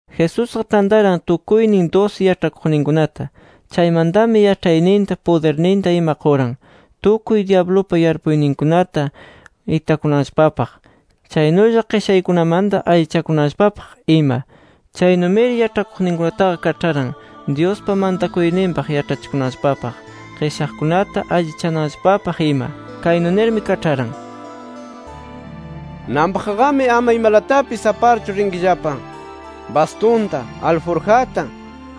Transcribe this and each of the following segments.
Jesusqa tantaran tukuynin dusi yaĉhakuqninkunata. Chaymantami yaĉhayninta, pudirninta ima quran, tukuy dyablupa yarpuyninkunata itakunanllapapaq chaynulla qishaykunamanta allichakunanllapapaq ima. Chaynumiri yaĉhakuqninkunataqa kaĉharan Dyuspa mantakuyninpaq yaĉhachikunanllapapaq, qishaqkunata allichananllapapaq ima. Kaynu nirmi kaĉharan: “Nanpaqqami ama imalatapis aparchu rinkillapa: Bastunta, alburjata,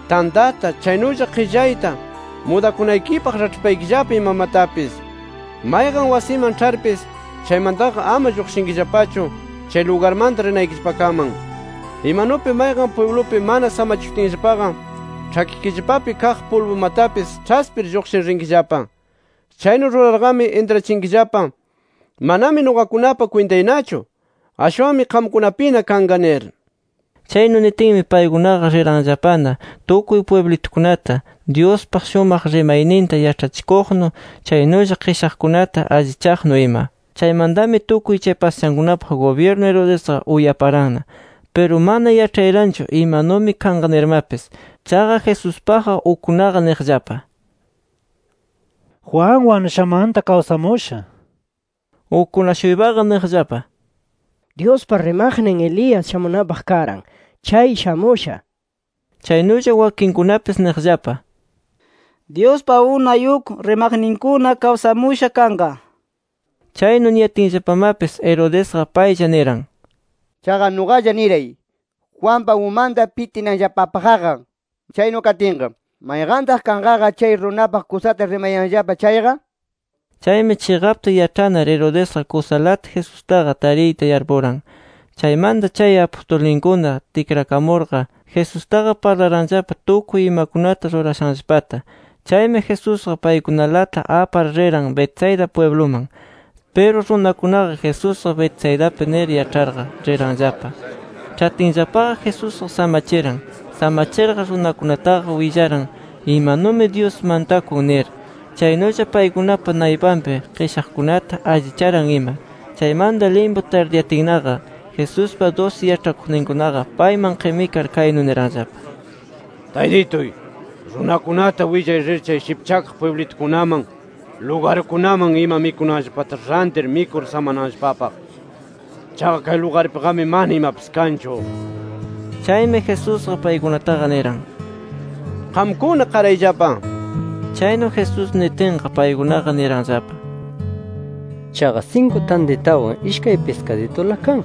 tantata, chaynulla qillayta, mudakunaykipaq raĉhpaykillapa imamatapis. Mayqan wasiman ĉharpis, chaymantaqa ama lluqshinkillapachu, chay lugarmanta rinaykillapakaman. Imanupi mayqan pwiblupi mana samachishunatinllapaqa, ĉhakikillapapi kaq pulbumatapis ĉhaspir lluqshir rinkillapa. Chaynu rurarqami intrachinkillapa: ‘Manami nuqakunapa kwintaynachu. Ashwanmi qamkunapina kanqa’ nir”. Chaynu nitinmi, paykunaqa riranllapana tukuy pwiblitukunata Dyuspa shumaq rimayninta yaĉhachikuqnu chaynulla qishaqkunata allichaqnu ima. Chaymantami tukuy chay pasashankunapaq gubyirnu Herodesqa uyaparanna. Piru mana yaĉhayaranchu imanumi kanqa nirmapis. Chaqa Jesuspaqqa ukkunaqa niqllapa: “Juan wanushanmanta kawsamusha” nir. Ukkuna-shuypaqa niqllapa: “Dyuspa rimaqnin Elías shamunanpaq karan, chay shamusha” nir. Chaynulla wakinkunapis niqllapa: “Dyuspa unay uk rimaqninkuna kawsamusha kanqa” nir. Chaynu niyatinllapamapis, Herodesqa paylla niran: “Chaqa nuqalla niray, Juanpa umanta pitinanllapapaqqa. Chaynu katinqa ¿mayqantaq kanqaqa chay runapaq kusata rimayanllapa chayqa?” nir. Chaymi chiqapta yaĉhanar Herodesqa kusalata Jesustaqa tariyta yarpuran. Chaymanta chay apustulninkuna tikrakamurqa Jesustaqa parlaranllapa tukuy imakunata rurashanllapata. Chaymi Jesusqa paykunalata apar riran Betsaida pwibluman. Piru runakunaqa, Jesusqa Betsaidapi nir yaĉharqa riranllapa. Ĉhatinllapaqa Jesusqa samachiran. Samachirqa runakunataqa willaran imanumi Dyus mantakun nir, chaynulla paykunapa naypanpi qishaqkunata allicharan, ima. Chaymanta limpu tardiyatinnaqa, Jesuspa dusi yaĉhakuqninkunaqa payman qimikar, kaynu niranllapa: —Taytituy, runakunata willay rir chay shipchakaq pwiblitukunaman, lugarkunaman ima mikunanllapata rantir mikur samananllapapaq. Chaqa kay lugarpiqami mana imapis kanchu nir. Chaymi Jesusqa paykunataqa, niran: —Qamkuna qarayllapa, nir. Chaynu Jesús nitinqa paykunaqa niranllapa: —Chaqa sinku tantitawan ishkay piskaditula kan.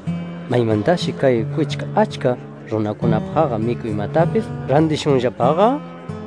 ¿Maymantashi kay kwichka achka runakunapaqqa mikuymatapis rantishunllapaqa?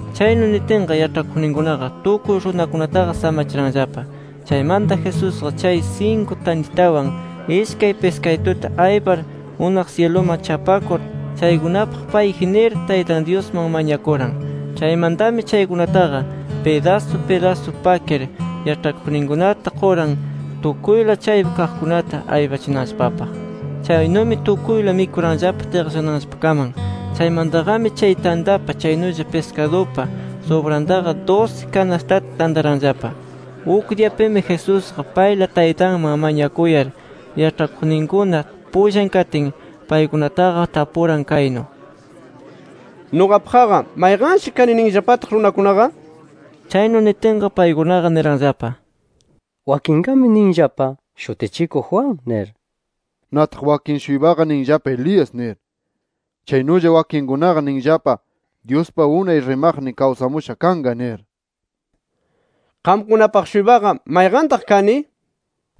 Chaynu nitinqa, yaĉhakuqninkunaqa tukuy runakunataqa samachiranllapa. Chaymanta Jesusqa chay sinku tantitawan, ishkay piskadituta aypar unaq syiluman chapakur, chaykunapaq payji nir, Taytan Dyusman mañakuran. Chaymantami chaykunataqa pidasu pidasu pakir yaĉhakuqninkunata quran tukuyla chaypi kaqkunata aypachinanllapapaq. Chaynumi tukuyla mikuranllapa tiqllananllapakaman. Chaymantaqami chay tantapa chaynulla piskadupa subrantaqa dusi kanastata tantaranllapa. Uk diyapimi Jesusqa payla Taytanman mañakuyar, yaĉhakuqninkuna pullan katin, paykunataqa tapuran kaynu: —¿Nuqapaqqa mayqanshi kani ninllapataq runakunaqa? nir. Chaynu nitinqa paykunaqa niranllapa: —Wakinqami ninllapa, Shutichikuq Juan nir. Nataq wakin-shuypaqa ninllapa Elías nir. Chaynulla wakinkunaqa ninllapa Dyuspa unay rimaqnin kawsamusha kanqa nir. —Qamkunapaq-shuypaqa ¿mayqantaq kani?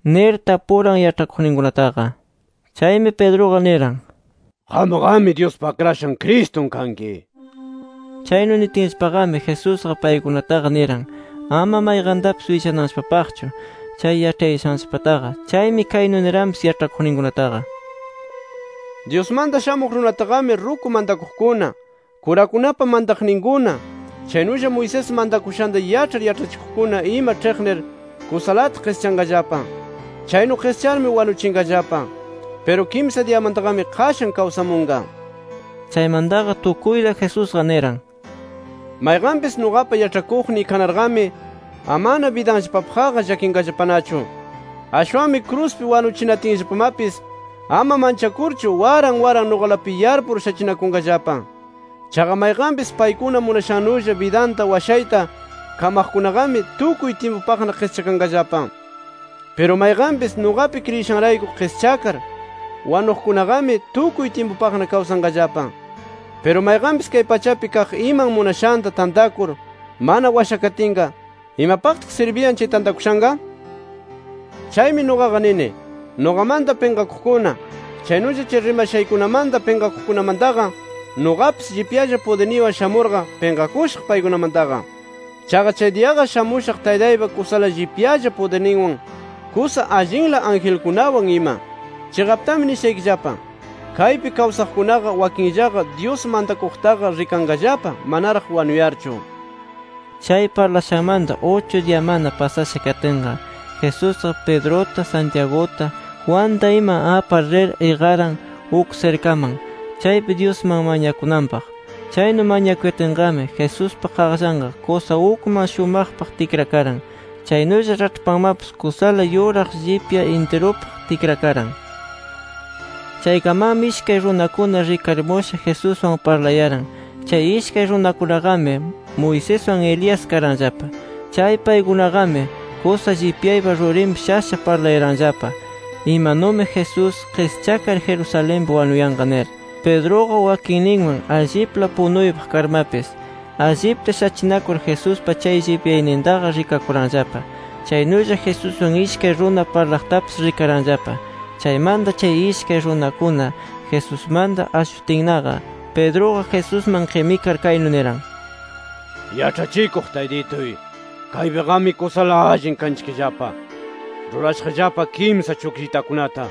—nir tapuran yaĉhakuqninkunataqa. Chaymi Pedruqa niran: —Qamqami Dyuspa Akrashan Cristun kanki nir. Chaynu nitinllapaqami Jesusqa paykunataqa niran, ama mayqantapis willananllapapaqchu, chay yaĉhayashanllapataqa. Chaymi kaynu niranpis yaĉhakuqninkunataqa: “Dyusmanta Shamuq Runataqami ruku mantakuqkuna, kurakunapa mantaqninkuna, chaynulla Moisés mantakushanta yaĉhar yaĉhachikuqkuna ima ĉhiqnir kusalata qischanqallapa. Chaynu qischarmi wanuchinqallapa. Piru kimsa diyamantaqami qashan kawsamunqa” nir. Chaymantaqa tukuyta Jesusqa niran: “Mayqanpis nuqapa yaĉhakuqniy kanarqami amana bidanllapapaqqa llakinqallapanachu. Ashwanmi kruspi wanuchinatinllapamapis ama manchakurchu waran waran nuqalapi yarpur shachinakunqallapa. Chaqa mayqanpis paykuna munashannulla bidanta washayta kamaqkunaqami tukuy tyimpupaqna qischakanqallapa. Piru mayqanpis nuqapi kriyishanrayku qischakar wanuqkunaqami tukuy tyimpupaqna kawsanqallapa. Piru mayqanpis kay pachapi kaq iman munashanta tantakur mana washakatinqa, ¿imapaqtaq sirbiyan chay tantakushanqa? Chaymi nuqaqa nini, nuqamanta pinqakuqkuna, chaynulla chay rimashaykunamanta pinqakuqkunamantaqa, nuqapis llipyalla pudirniywan shamurqa pinqakushaq paykunamantaqa. Chaqa chay diyaqa shamushaq Taytaypa kusala llipyalla pudirninwan, kusa allinla angelkunawan ima. Chiqaptami nishaykillapa: Kaypi kawsaqkunaqa wakinllaqa Dyus mantakuqtaqa rikanqallapa manaraq wanuyarchu”. Chay parlashanmanta uchu diyamana pasasha katinqa Jesusqa Pedruta, Santiaguta, Juanta ima apar rir iqaran uk sirkaman, chaypi Dyusman mañakunanpaq. Chaynu mañakuyatinqami Jesuspa qaqllanqa kusa ukman shumaqpaq tikrakaran. Chaynulla raĉhpanmapis kusala yuraq llipya intirupaq tikrakaran. Chaykamanmi ishkay runakuna rikarimusha Jesuswan parlayaran. Chay ishkay runakunaqami Moiseswan Elías karanllapa. Chay paykunaqami kusa llipyaypa rurinpi shasha parlayaranllapa, imanumi Jesús qischakar Jerusalenpi wanuyanqa nir. Pedruqa wakinninwan allipla punuypaq karmapis, allipta shachinakur Jesuspa chay llipyaynintaqa rikakuranllapa. Chaynulla Jesuswan ishkay runa parlaqtapis rikaranllapa. Chaymanta chay ishkay runakuna Jesusmanta ashuyatinnaqa, Pedruqa Jesusman qimikar, kaynu niran: —Yaĉhachikuq Taytituy, ¡kaypiqami kusala allin kanchikllapa! Rurashaqllapa kimsa chukllitakunata,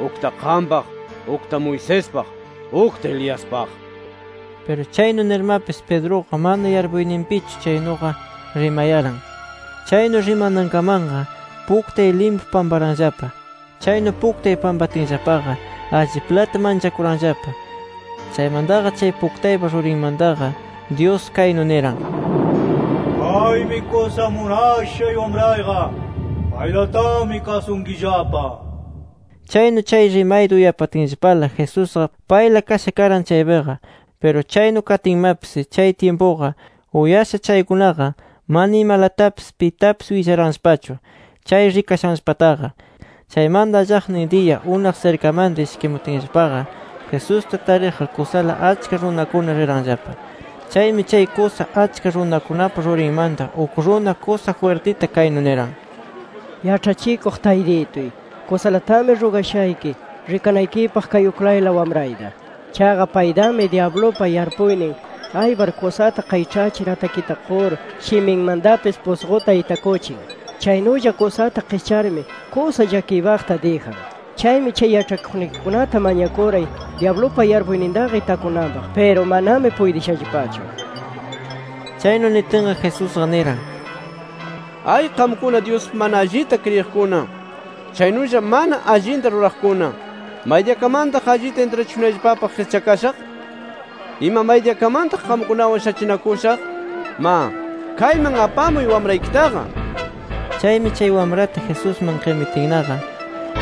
ukta qampaq, ukta Moisespaq, ukta Eliaspaq nir. Piru chaynu nirmapis Pedruqa mana yarpuyninpichu chaynuqa rimayaran. Chaynu rimanankamanqa puktay limpu pamparanllapa. Chaynu puktay pampatinllapaqa alliplata manchakuranllapa. Chaymantaqa chay puktaypa rurinmantaqa Dyus kaynu niran: “Kaymi kusa munashay Wamrayqa. ¡Paylatami kasunkillapa!” nir. Chaynu chay rimayta uyapatinllapala Jesusqa payla kasha karan chaypiqa. Piru chaynu katinmapis, chay tyimpuqa, uyasha chaykunaqa mana imalatapis pitapis willaranllapachu, chay rikashanllapataqa. Chaymanta allaqnin diya unaq sirkamanta ishkimutinllapaqa, Jesusta tariqqa kusala achka runakuna riranllapa. Chaymi chay kusa achka runakunapa rurinmanta uk runa, kusa jwirtita kaynu niran: —Yaĉhachikuq Taytituy, kusalatami rugashayki rikanaykipaq kay uklayla wamrayta. Chaqa paytami dyablupa yarpuynin aypar kusata qayĉhachir atakita qur, shiminmantapis pusquta itakuchin. Chaynulla kusata qischarmi kusa llakiypaqta dijan. Chaymi chay yaĉhakuqnikikunata mañakuray dyablupa yarpuynintaqa itakunanpaq. Piru manami puytishallapachu nir. Chaynu nitinqa, Jesusqa niran: —¡Ay qamkuna Dyuspi mana allita kriyiqkuna, chaynulla mana allinta ruraqkuna! ¿Maydiyakamantaq allita intrachishunayllapapaq qischakashaq? ¿Ima maydiyakamantaq qamkunawan shachinakushaq? Ma, kayman apamuy wamraykitaqa nir. Chaymi chay wamrata Jesusman qimitinnaqa,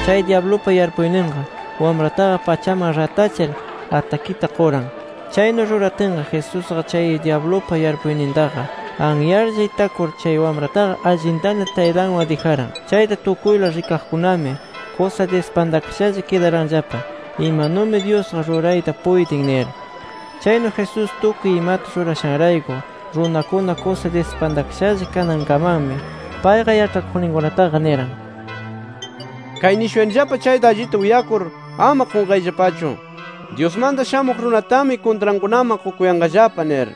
chay dyablupa yarpuyninqa wamrataqa pachaman ratachir atakita quran. Chaynu ruratinqa Jesusqa, chay dyablupa yarpuynintaqa anyarlla itakur, chay wamrataqa allintana taytanwan dijaran. Chayta tukuyla rikaqkunami kusa dispantakashalla kidaranllapa, imanumi Dyusqa rurayta puytin nir. Chaynu Jesús tukuy imata rurashanrayku runakuna kusa dispantakashalla kanankamanmi, payqa yaĉhakuqninkunataqa niran: —Kay nishuyanillapa chayta allita uyakur ama qunqayllapachu, Dyusmanta Shamuq Runatami kuntrankunaman qukuyanqallapa nir.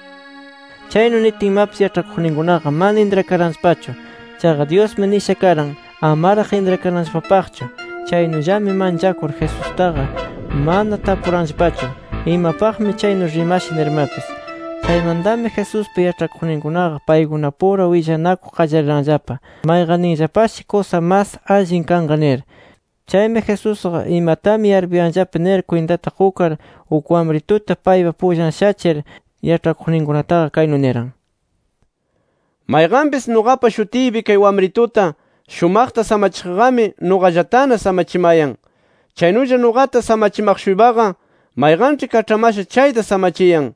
Chaynu nitinmapis, yaĉhakuqninkunaqa mana intrakaranllapachu. Chaqa Dyusmi nisha karan amaraq intrakananllapapaqchu. Chaynullami manchakur Jesustaqa mana tapuranllapachu, imapaqmi chaynu rimasha nirmapis. Chaymantami Jesuspa yaĉhakuqninkunaqa paykunapura willanakuq qallariranllapa, mayqanninllapashi kusa mas allin kanqa nir. Chaymi Jesusqa imatami yarpuyanllapa nir kwintata qukar, uk wamrituta paypa pullan shachir, yaĉhakuqninkunataqa kaynu niran: “Mayqanpis nuqapa shutiypi kay wamrituta shumaqta samachiqqami, nuqallatana samachimayan. Chaynulla nuqata samachimaq-shuypaqa, mayqanĉhi kaĉhamasha chayta samachiyan.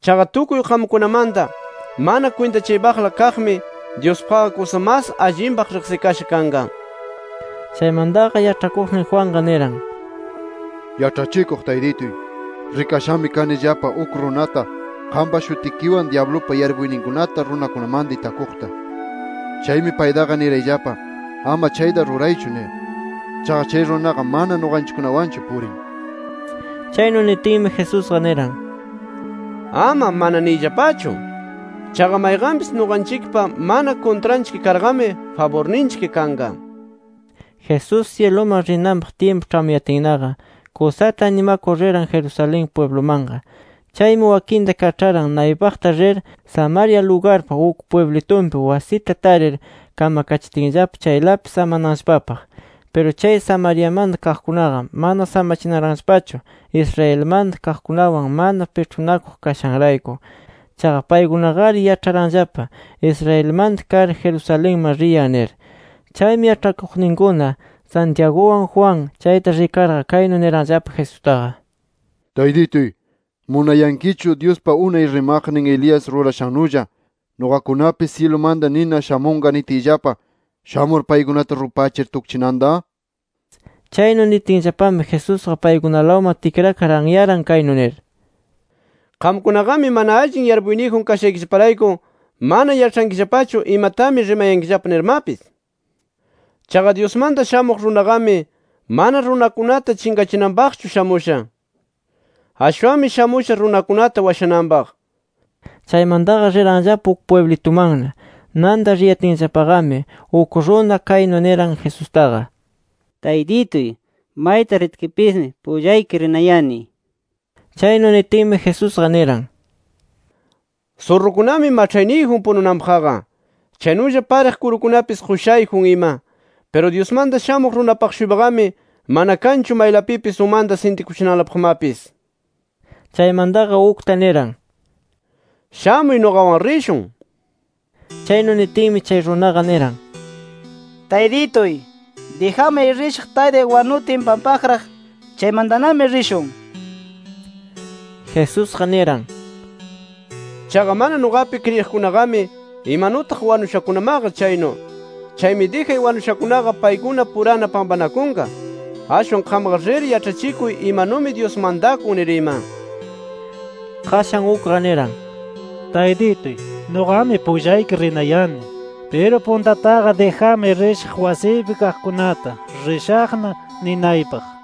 Chaqa tukuy qamkunamanta mana kwintachaypaqla kaqmi, Dyuspaqqa kusa mas allinpaq riqsikasha kanqa”. Chaymantaqa yaĉhakuqnin Juanqa niran: —Yaĉhachikuq Taytituy, rikashami kanillapa uk runata qampa shutikiwan dyablupa yarpuyninkunata runakunamanta itakuqta. Chaymi paytaqa nirayllapa ama chayta ruraychu nir. Chaqa chay runaqa mana nuqanchikkunawanchu purin nir. Chaynu nitinmi Jesusqa niran: —Ama ‘Mana’ niyllapachu. Chaqa mayqanpis nuqanchikpa mana kuntranchik karqami, faburninchik kanqa nir. Jesús syiluman rinanpaq tyimpu ĉhamuyatinnaqa, kusata animakur riran Jerusalén pwiblumanqa. Chaymi wakinta kaĉharan naypaqta rir, Samaria lugarpa uk pwiblitunpi wasita tarir kamakachitinllapa chaylapi samananllapapaq. Piru chay Samariamanta kaqkunaqa mana samachinaranllapachu, Israelmanta kaqkunawan mana piĉhunakuq kashanrayku. Chaqa paykunaqari yaĉharanllapa Israelmanta kar Jerusalenman riyan nir. Chaymi yaĉhakuqninkuna Santiaguwan Juan chayta rikarqa, kaynu niranllapa Jesustaqa: —Taytituy, ¿munayankichu [Dyuspa unay rimaqnin Elías rurashannulla] nuqakunapis syilumanta nina shamunqa nitiyllapa, shamur paykunata rupachir tukchinanta? Chaynu nitinllapami Jesusqa paykunalawman tikrakar anyaran [kaynu nir: —Qamkunaqami mana allin yarpuyniyjun kashaykillaparayku mana yaĉhankillapachu imatami rimayankillapa nirmapis. Chaqa Dyusmanta Shamuq Runaqami, mana runakunata chinqachinanpaqchu shamusha. Ashwanmi shamusha runakunata washananpaq]. Chaymantaqa riranllapa uk pwiblitumanna. Nanta riyatinllapaqami, uk runa kaynu niran Jesustaqa: —Taytituy, mayta ritkipismi pullayki rinayani nir. Chaynu nitinmi Jesusqa niran: —Surrukunami maĉhayniyjun pununanpaqqa. Chaynulla pariq kurukunapis qushayjun ima. Piru Dyusmanta Shamuq Runapaq-shuypaqami mana kanchu maylapipis umanta sintikuchinanlapaqmapis nir. Chaymantaqa ukta niran: —Shamuy nuqawan rishun nir. Chaynu nitinmi chay runaqa niran: —Taytituy, dijamay rishaq taytay wanutin pampaqraq. Chaymantanami rishun nir. Jesusqa niran: —Chaqa mana nuqapi kriyiqkunaqami imanutaq wanushakunamaqa chaynu. Chaymi dijay wanushakunaqa paykunapurana pampanakunqa. Ashwan qamqa rir yaĉhachikuy imanumi Dyus mantakun nir ima. Qashan ukqa niran: —Taytituy, nuqami pullayki rinayani. Piru puntataqa dijamay rishaq wasiypi kaqkunata ‘Rishaqna’ ninaypaq.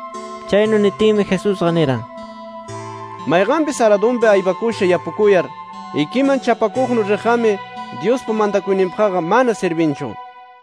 Chaynu nitinmi Jesusqa niran: —Mayqanpis aradunpi aypakusha yapukuyar, ikiman chapakuqnu riqqami, Dyuspa mantakuyninpaqqa mana sirbinchu nir.